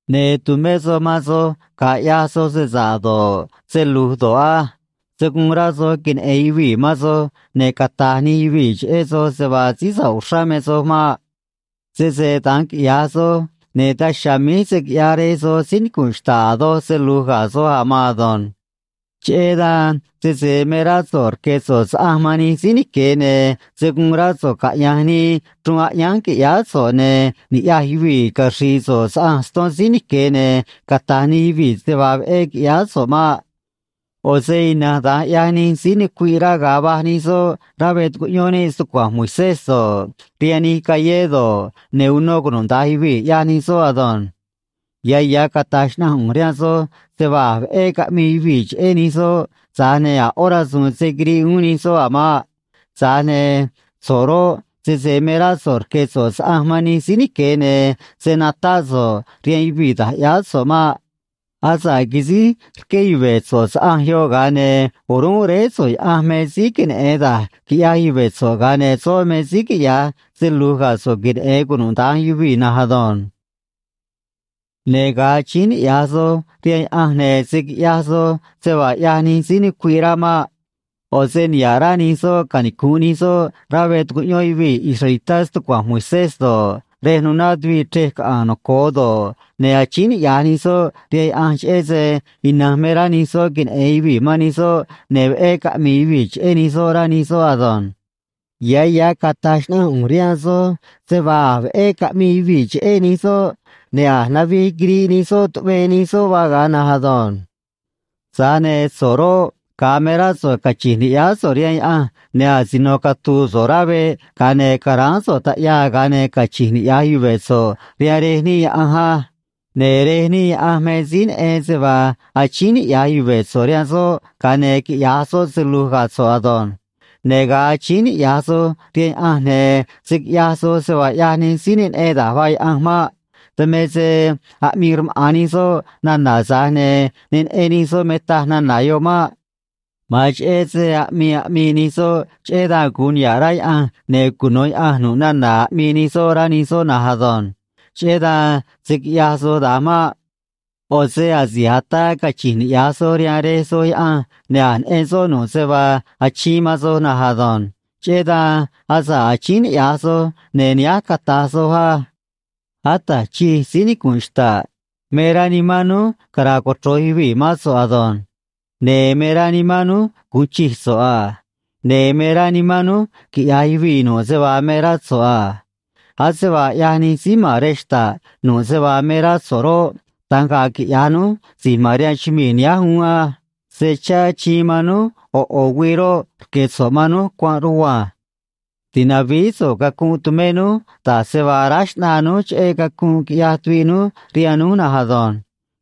’Ne̱ tu̱mé soj man soj ga̱a ꞌyaj soj se sa̱ꞌ do̱ꞌ, se lu̱j do̱ꞌ á. Se̱ guun rá soj queneꞌe̱n yuvii̱ man soj ne̱ cata̱j nij yuvii̱ cheꞌé soj se vaa síí sa̱ꞌ uxrá me soj maꞌ. Sese da̱nj quiꞌya̱j soj, ne̱ daj chiha̱a̱ míj se̱ quiꞌyaj Rej soj síí nicu̱nꞌ xta̱ꞌ a̱ doj se lu̱j ga̱ soj a̱ maan ado̱nj. Cheꞌé dan sese me rá so̱ꞌ rque̱ so̱ꞌ saꞌanj man nij síí nique̱, ne̱ se̱ guun rá so̱ꞌ caꞌya̱nj nii chruun aꞌyánj qui̱ꞌyáá so̱ꞌ, ne̱ ni̱ꞌyaj yuvii̱ caxri̱i̱ so̱ꞌ saꞌanj ston síí nique̱, ne̱ cata̱j nij yuvii̱ se vaa veꞌé quiꞌyáá so̱ꞌ maꞌ. ꞌO̱ se ina̱nj da̱nj ꞌyaj nij síí nucuiꞌ rá ga̱a va̱j nij soꞌ rá veꞌ tucuꞌyón níꞌ stucua̱nj Moisés do̱ꞌ, rihaan nij callé do̱ꞌ, ne̱ uno cunuda̱nj yuvii̱, ꞌyaj nij soꞌ ado̱nj. Ya̱ ya̱ cata̱j xnaꞌanj ꞌu̱nj rihaan soj se vaa a̱j veꞌé caꞌmii yuvii̱ cheꞌé nij soꞌ, tza̱j ne̱ a̱ ꞌó rasu̱u̱n se̱ quiriꞌ uún nij soꞌ a̱ maꞌ. Tza̱j ne̱ so̱ꞌ roꞌ, sese me rá so̱ꞌ rque̱ so̱ꞌ saꞌanj man nij síí nique̱, ne̱ se̱ natáꞌ so̱ꞌ rihaan yuvii̱ da̱j ꞌyáá so̱ꞌ maꞌ. Asa̱ꞌ quisíj rqué yuve̱ so̱ꞌ saꞌanj yoꞌ, ga̱a ne̱ o̱rúnꞌ Réé so̱ꞌ Yaꞌanj me síí queneꞌe̱n da̱j quiꞌyaj yuve̱ so̱ꞌ, ga̱a ne̱ soꞌ me síí quiꞌya̱j se lu̱j ga̱ so̱ꞌ queneꞌe̱n cunuda̱nj yuvii̱ na̱nj ado̱nj. ’Ne̱ ga̱a achíín niꞌya̱j soj rihaan Yaꞌanj, ne̱ se̱ quiꞌyaj soj se vaa ꞌyaj nij síí nucuiꞌ rá maꞌ. ꞌO̱ se niha̱ꞌ rá nij soꞌ canicu̱nꞌ nij soꞌ rá veꞌ tucuꞌyón yuvii̱ israelitá stucua̱nj Moisés do̱ꞌ, rej nuná tuviꞌ chrej caꞌa̱a̱n noco̱o do̱ꞌ, ne̱ achíín niꞌya̱j nij soꞌ rihaan Yaꞌanj, cheꞌé se ina̱nj me rá nij soꞌ queneꞌe̱n yuvii̱ man nij soꞌ, ne̱ veꞌé caꞌmi̱i̱ yuvii̱ cheꞌé nij soꞌ, rá nij soꞌ ado̱nj. Ya̱ ya̱ cata̱j xnaꞌanj ꞌu̱nj rihaan soj se vaa a̱j veꞌé caꞌmii yuvii̱ cheꞌé nij soꞌ, ne̱ a̱j navij quiriꞌ nij soꞌ tuꞌvee nij soꞌ vaa ga̱a na̱nj ado̱nj. Tza̱j ne̱ so̱ꞌ roꞌ, ga̱a me rá so̱ꞌ cachi̱nj ni̱ꞌyáá so̱ꞌ rihaan Yaꞌanj, ne̱ asino catu̱u̱ so̱ꞌ rá veꞌ, ga̱a ne̱ ca̱ráán so̱ꞌ taꞌyaa, ga̱a ne̱ cachi̱nj niꞌya̱j yuve̱ so̱ꞌ rihaan Rej níꞌ Yaꞌanj á. Ne̱ Rej níꞌ Yaꞌanj me síí neꞌen se vaa achíín niꞌya̱j yuve̱ so̱ꞌ rihaan soꞌ, ga̱a ne̱ quiꞌya̱j soꞌ se lu̱j ga̱ so̱ꞌ ado̱nj. ’Ne̱ ga̱a achíín niꞌya̱j soj rihaan Yaꞌanj, ne̱ se̱ quiꞌyaj soj se vaa ꞌyaj nij síí ne neꞌen da̱j vaa Yaꞌanj maꞌ. Dan me se aꞌmii rmaꞌa̱n nij soꞌ nana̱, tza̱j ne̱ ne neꞌen nij soꞌ me taj nana̱ yoꞌ maꞌ. Ma̱an cheꞌé se aꞌmii aꞌmii nij soꞌ, cheꞌé dan gu̱un niha̱ꞌ rá Yaꞌanj ne̱ cuno̱ Yaꞌanj nu̱ꞌ nana̱ aꞌmii nij soꞌ, rá nij soꞌ na̱nj ado̱nj. Cheꞌé dan se̱ quiꞌyaj soj da̱nj maꞌ. ꞌO̱ se asi̱j ataa cachi̱nj niꞌya̱j soj rihaan Rej soj Yaꞌanj, ne̱ a̱j neꞌen soꞌ nu̱ꞌ se vaa achiin man soj na̱nj ado̱nj. Cheꞌé dan asa̱ꞌ achíín niꞌya̱j soj, ne̱ nihánj cata̱j soj á: Ata̱j Chij, síí nicu̱nꞌ xta̱ꞌ, me rá nimán núj cara̱a̱ cochro̱j yuvii̱ mán so̱ꞌ ado̱nj. Ne̱ me rá nimán núj gu̱un chij so̱ꞌ a. Ne̱ me rá nimán núj quiꞌya̱j yuvii̱ nu̱ꞌ se vaa me rá so̱ꞌ a. Ase vaa ꞌyaj nij síí ma̱n rej xta̱ꞌ nu̱ꞌ se vaa me rá so̱ꞌ roꞌ, da̱nj ga̱a̱ quiꞌya̱j núj si̱j ma̱n rihaan chumii̱ nihánj uún á. Se chá achiin man núj ꞌo̱ ꞌo̱ güii roꞌ, rque̱ so̱ꞌ man núj cuanꞌ rugua̱nj. Ti̱navíí so̱ꞌ cacunꞌ tumé núj, da̱j se vaa aráj xꞌnaa núj cheꞌé cacunꞌ quiꞌyaj tuviꞌ núj rihaan núj na̱nj ado̱nj.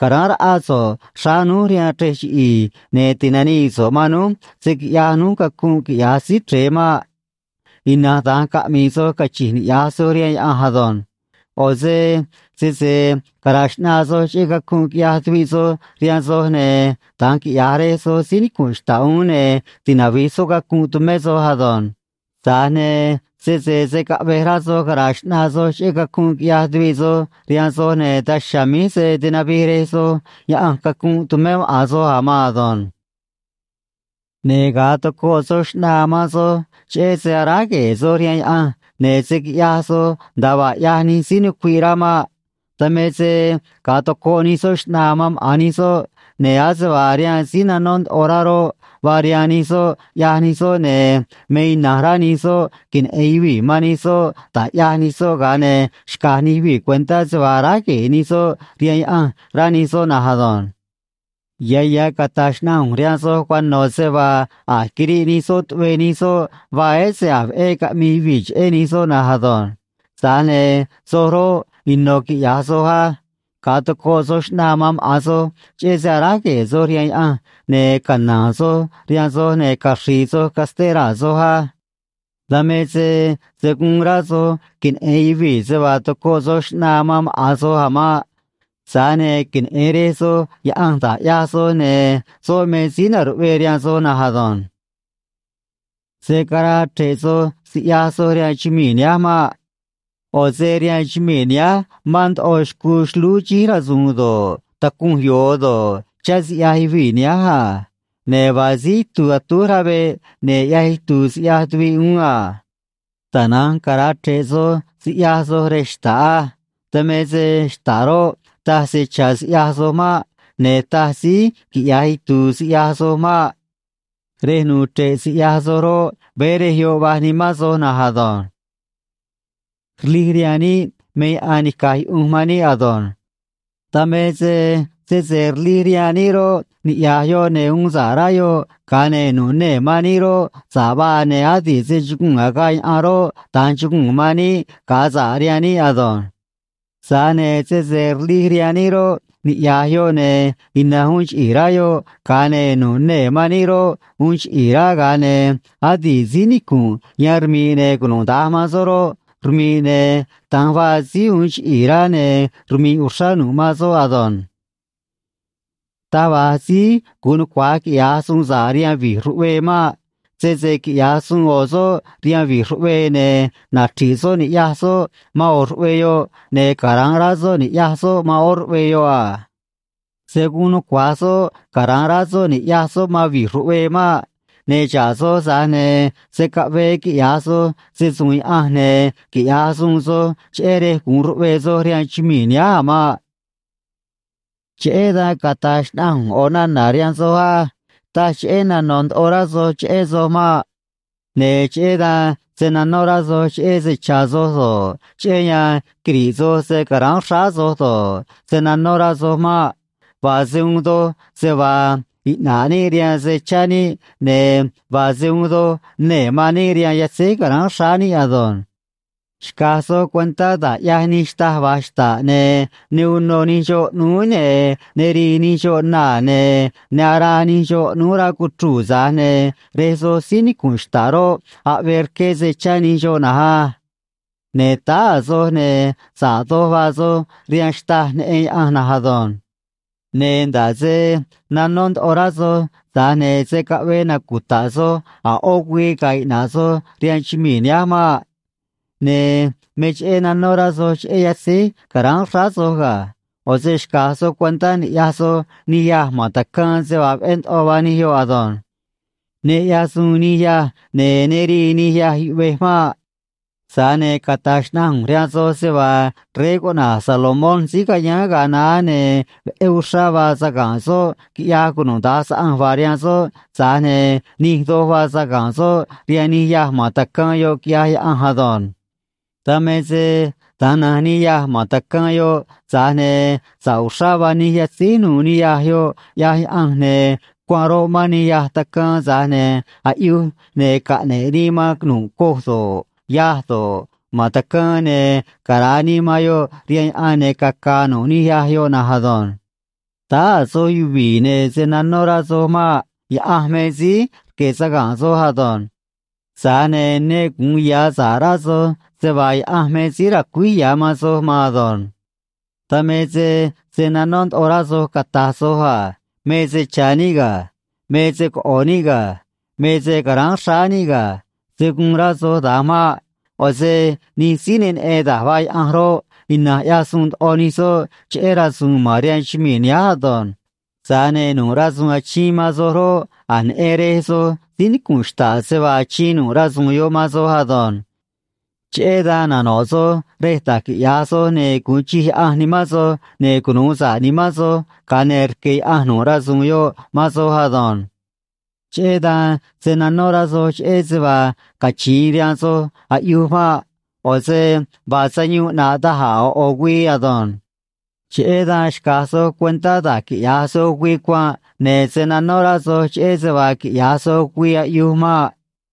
Ca̱ráán raꞌá so̱ꞌ xráá núj rihaan chrej chiꞌi̱i̱, ne̱ ti̱nanii so̱ꞌ man núj se̱ quiꞌyaj núj cacunꞌ, quiꞌya̱j Síí Chre̱e maꞌ. Ina̱nj da̱nj caꞌmi̱i̱ soj cachi̱nj niꞌya̱j soj rihaan Yaꞌanj ado̱nj. ’ꞌO̱ se sese cara̱a̱ xꞌnaa soj cheꞌé cacunꞌ quiꞌyaj tuviꞌ soj rihaan soj, ne̱ da̱nj quiꞌya̱j Rej soj síí nicu̱nꞌ xta̱ꞌ uún, ne̱ tinavi̱j soꞌ cacunꞌ tumé soj ado̱nj. Tza̱j ne̱ sese se̱ caꞌvej rá soj cara̱a̱ xꞌnaa soj cheꞌé cacunꞌ quiꞌyaj tuviꞌ soj rihaan soj, ne̱ daj chiha̱a̱ míj se̱ tinavij Rej soj Yaꞌanj cacunꞌ tumé maꞌa̱n soj a̱ maan ado̱nj. ’Ne̱ ga̱a tocoꞌ soj xꞌnaa man soj cheꞌé se aráj gue̱e̱ soj rihaan Yaꞌanj, ne̱ se̱ quiꞌyaj soj nda̱a vaa ꞌyaj nij síí nucuiꞌ rá maꞌ. Dan me se ga̱a tocoꞌ nij soꞌ xꞌnaa man maꞌa̱n nij soꞌ, ne̱ ase vaa rihaan síí nanó ndoꞌo rá roꞌ, vaa rihaan nij soꞌ, ꞌyaj nij soꞌ, ne̱ me ina̱nj rá nij soꞌ queneꞌe̱n yuvii̱ man nij soꞌ da̱j ꞌyaj nij soꞌ ga̱a ne̱ xca̱j nij yuvii̱ cuentá se vaa aráj gue̱e̱ nij soꞌ rihaan Yaꞌanj, rá nij soꞌ na̱nj ado̱nj. Ya̱ ya̱ cata̱j xnaꞌanj ꞌu̱nj rihaan soj cuano̱ se vaa a̱j quiriꞌ nij soꞌ tuꞌvee nij soꞌ vaa, ese a̱j veꞌé caꞌmii yuvii̱ cheꞌé nij soꞌ na̱nj ado̱nj. Tza̱j ne̱ soj roꞌ, ino̱ quiꞌya̱j soj á. Ga̱a tocoꞌ soj xꞌnaa man maꞌa̱n soj cheꞌé se aráj gue̱e̱ soj rihaan Yaꞌanj, ne̱ cana̱a̱n soj rihaan soj ne̱ caxri̱i̱ soj casté raa̱ soj á. Dan me se se̱ guun rá soj queneꞌe̱n yuvii̱ se vaa tocoꞌ soj xꞌnaa man maꞌa̱n soj a̱ maꞌ. Tza̱j ne̱ queneꞌe̱n Rej soj Yaꞌanj da̱j ꞌyaj soj, ne̱ soꞌ me síí na̱ruꞌvee rihaan soj na̱nj ado̱nj. ’Se̱ caraa chre̱ꞌ soj siꞌyaj soj rihaan chumii̱ nihánj maꞌ. ꞌO̱ se rihaan chumii̱ nihánj mán ndoꞌo xcuu xlúú xíj rasu̱u̱n do̱ꞌ, tacunj yo̱o do̱ꞌ, chá siꞌyaj yuvii̱ nihánj a. Ne̱ vaa síí itu̱u̱ atúj rá veꞌ ne̱ ꞌyaj itu̱u̱ siꞌyaj tuviꞌ uún a. Tana̱nj cara̱a chre̱ꞌ soj siꞌyaj soj rej xta̱ꞌ á. Dan me se xta̱ꞌ roꞌ, taj se cha̱ siꞌyaj soj maꞌ. Ne̱ taj síí quiꞌya̱j itu̱u̱ siꞌyaj soj maꞌ. Rej nu̱u̱ chre̱ꞌ siꞌyaj soj roꞌ, veé rej yoꞌ vaj nimán soj na̱nj ado̱nj. ’Rlij rihaan níꞌ me yaꞌan nica̱j yuꞌunj man níꞌ ado̱nj. Dan me se sese rlij rihaan níꞌ roꞌ, niꞌya̱j yoꞌ ne̱ uun sa̱ꞌ rá yoꞌ, ga̱a ne̱ nu̱ꞌ nee̱ man níꞌ roꞌ, sa̱ꞌ vaa, ne̱ adi̱ꞌ se chuguu̱n agaꞌ yaꞌan roꞌ, da̱nj chuguu̱n man níꞌ ga̱a sa̱ꞌ rihaan níꞌ ado̱nj. Tza̱j ne̱ sese rlij rihaan níꞌ roꞌ, niꞌya̱j yoꞌ ne̱ ina̱nj uun chiꞌi̱i̱ rá yoꞌ, ga̱a ne̱ nu̱ꞌ nee̱ man níꞌ roꞌ, uun chiꞌi̱i̱ rá, ga̱a ne̱ adi̱ꞌ síí nicu̱nꞌ yan rmi̱ꞌ ne̱ cunuda̱nj man soꞌ roꞌ, rmi̱ꞌ, ne̱ da̱nj vaa síí uun chiꞌi̱i̱ rá, ne̱ rmi̱ꞌ uxrá nu̱ꞌ man soꞌ ado̱nj. ’Taj va̱j síí gu̱un nucua̱j quiꞌya̱j suun sa̱ꞌ rihaan vi̱j ruꞌvee maꞌ. Sese quiꞌya̱j suun ꞌo̱ soꞌ rihaan vi̱j ruꞌvee, ne̱ nachri̱ꞌ soꞌ ni̱ꞌyaj soꞌ man ꞌo̱ ruꞌvee yoꞌ, ne̱ cara̱nꞌ rá soꞌ ni̱ꞌyaj soꞌ man ꞌó ruꞌvee yoꞌ a. Se̱ guun nucua̱j soꞌ cara̱nꞌ rá soꞌ ni̱ꞌyaj soꞌ man vi̱j ruꞌvee maꞌ. Ne̱ xa̱ꞌ soj, tza̱j ne̱ se̱ caꞌvee quiꞌya̱j soj se‑su̱u̱n Yaꞌanj ne̱ quiꞌya̱j suun soj cheꞌé rej gu̱un ruꞌvee soj rihaan chumii̱ nihánj a̱ maꞌ. ’Cheꞌé dan cata̱j xnaꞌanj ꞌu̱nj ꞌo̱ nana̱ rihaan soj á: Taj cheꞌé nano̱ ndoꞌo rá soj cheꞌé soj maꞌ. Ne̱ cheꞌé dan se̱ nanó rá soj cheꞌé se cha̱ soj do̱ꞌ, cheꞌé yan quiri̱ꞌ soj se ca̱ráán xráá soj do̱ꞌ, se̱ nanó rá soj maꞌ. Vaa se uun doj se vaa iꞌna̱ꞌ níꞌ rihaan se cha̱ níꞌ, ne̱ vaa se uun doj nee̱ man níꞌ rihaan yatzéj ca̱ráán xráá níꞌ ado̱nj. ’Xca̱j soj cuentá da̱j ꞌyaj nij xtâj va̱j xta̱ꞌ, ne̱ ne unô nij xoꞌ ꞌnúú, ne̱ ne rii nij xoꞌ naa̱, ne̱ ne araa nij xoꞌ ꞌnúú rá cuchruu̱, tza̱j ne̱ Rej soj síí nicu̱nꞌ xta̱ꞌ roꞌ, aꞌvee rqué se chá nij xoꞌ na̱nj á. Ne̱ táá a̱ soj, ne̱ sa̱ꞌ doj vaa soj rihaan xtâj neꞌen Yaꞌanj na̱nj ado̱nj. Ne̱ nda̱ꞌ se nanó ndoꞌo rá soj, tza̱j ne̱ se̱ caꞌvee nacuta̱ꞌ soj a̱ ꞌó güii ga̱a̱ iꞌna̱ꞌ soj rihaan chumii̱ nihánj maꞌ. ’Ne̱ me cheꞌé nanó rá soj cheꞌé yatzíj ca̱ráán xráá soj ga̱. ꞌO̱ se xca̱j soj cuentá ni̱ꞌyaj soj nij yâj ma̱n tacaan se vaa veꞌé ndoꞌo vaa nij yoꞌ ado̱nj. Ne ꞌyaj suun nij yâj, ne̱ ne rii nij yâj yuꞌvej maꞌ. Tza̱j ne̱ cata̱j xnaꞌanj ꞌu̱nj rihaan soj se vaa rey cuꞌna̱j Salomón síí cayáán ga̱a naá, ne̱ veꞌé uxrá vaa saga̱nꞌ soꞌ, quiꞌyaj cunuda̱nj saꞌanj vaa rihaan soꞌ, tza̱j ne̱ nij doj vaa saga̱nꞌ soꞌ rihaan nij yâj ma̱n tacaan yoꞌ, quiꞌyaj Yaꞌanj ado̱nj. Dan me se da̱nj na̱nj nij yâj ma̱n tacaan yoꞌ, tza̱j ne̱ sa̱ꞌ uxrá vaa nij yatzíj nu̱u̱ nij yâj yoꞌ, ꞌyaj Yaꞌanj, ne̱ cuanꞌ roꞌ, mán nij yâj tacaan, tza̱j ne̱ aꞌyuj ne̱ caꞌne̱ꞌ nii man nu̱ꞌ coj do̱ꞌ, yâj do̱ꞌ, ma̱n tacaan, ne̱ cara̱a nii man yoꞌ rihaan yaꞌan, ne̱ caca̱a̱ nu̱ꞌ nij yâj yoꞌ na̱nj ado̱nj. Táá a̱ soj yuvi̱i̱, ne̱ se̱ nanó rá soj maꞌ. Yaꞌanj me síí rque̱ saga̱nꞌ soj ado̱nj. Tza̱j ne̱ ne gu̱un ya̱ sa̱ꞌ rá soj se vaa Yaꞌanj me síí ra̱cuíj ya̱ man soj maan ado̱nj. ’Dan me se se̱ nanó ndoꞌo rá soj cata̱j soj a: “Me se cha̱ níꞌ ga̱. Me se coꞌo̱ níꞌ ga̱. Me se ca̱ráán xráá níꞌ ga̱.” Se̱ guun rá soj da̱nj maꞌ. ꞌO̱ se nij síí ne neꞌen da̱j vaa Yaꞌanj roꞌ, ina̱nj ꞌyaj suun ndoꞌo nij soꞌ cheꞌé rasu̱u̱n ma̱n rihaan chumii̱ nihánj ado̱nj. Tza̱j ne̱ nu̱ꞌ rasu̱u̱n achiin man soj roꞌ, a̱j neꞌen Rej soj síí nicu̱nꞌ xta̱ꞌ se vaa achiin nu̱ꞌ rasu̱u̱n yoꞌ man soj ado̱nj. Cheꞌé dan nano̱ꞌ soj rej da̱j quiꞌya̱j soj ne̱ gu̱un chij Yaꞌanj nimán soj ne̱ cunu̱u sa̱ꞌ nimán soj, ga̱a ne̱ rque̱ Yaꞌanj nu̱ꞌ rasu̱u̱n yoꞌ man soj ado̱nj. Cheꞌé dan se̱ nanó rá soj cheꞌé se vaa cachi̱in rihaan soj aꞌyuj maꞌ. ꞌO̱ se vaa sayuun ꞌnaꞌ da̱j a̱ ꞌo̱ ꞌo̱ güii ado̱nj. Cheꞌé dan xca̱j soj cuentá da̱j quiꞌya̱j soj güii cuanꞌ, ne̱ se̱ nanó rá soj cheꞌé se vaa quiꞌya̱j soj güii aꞌyuj maꞌ.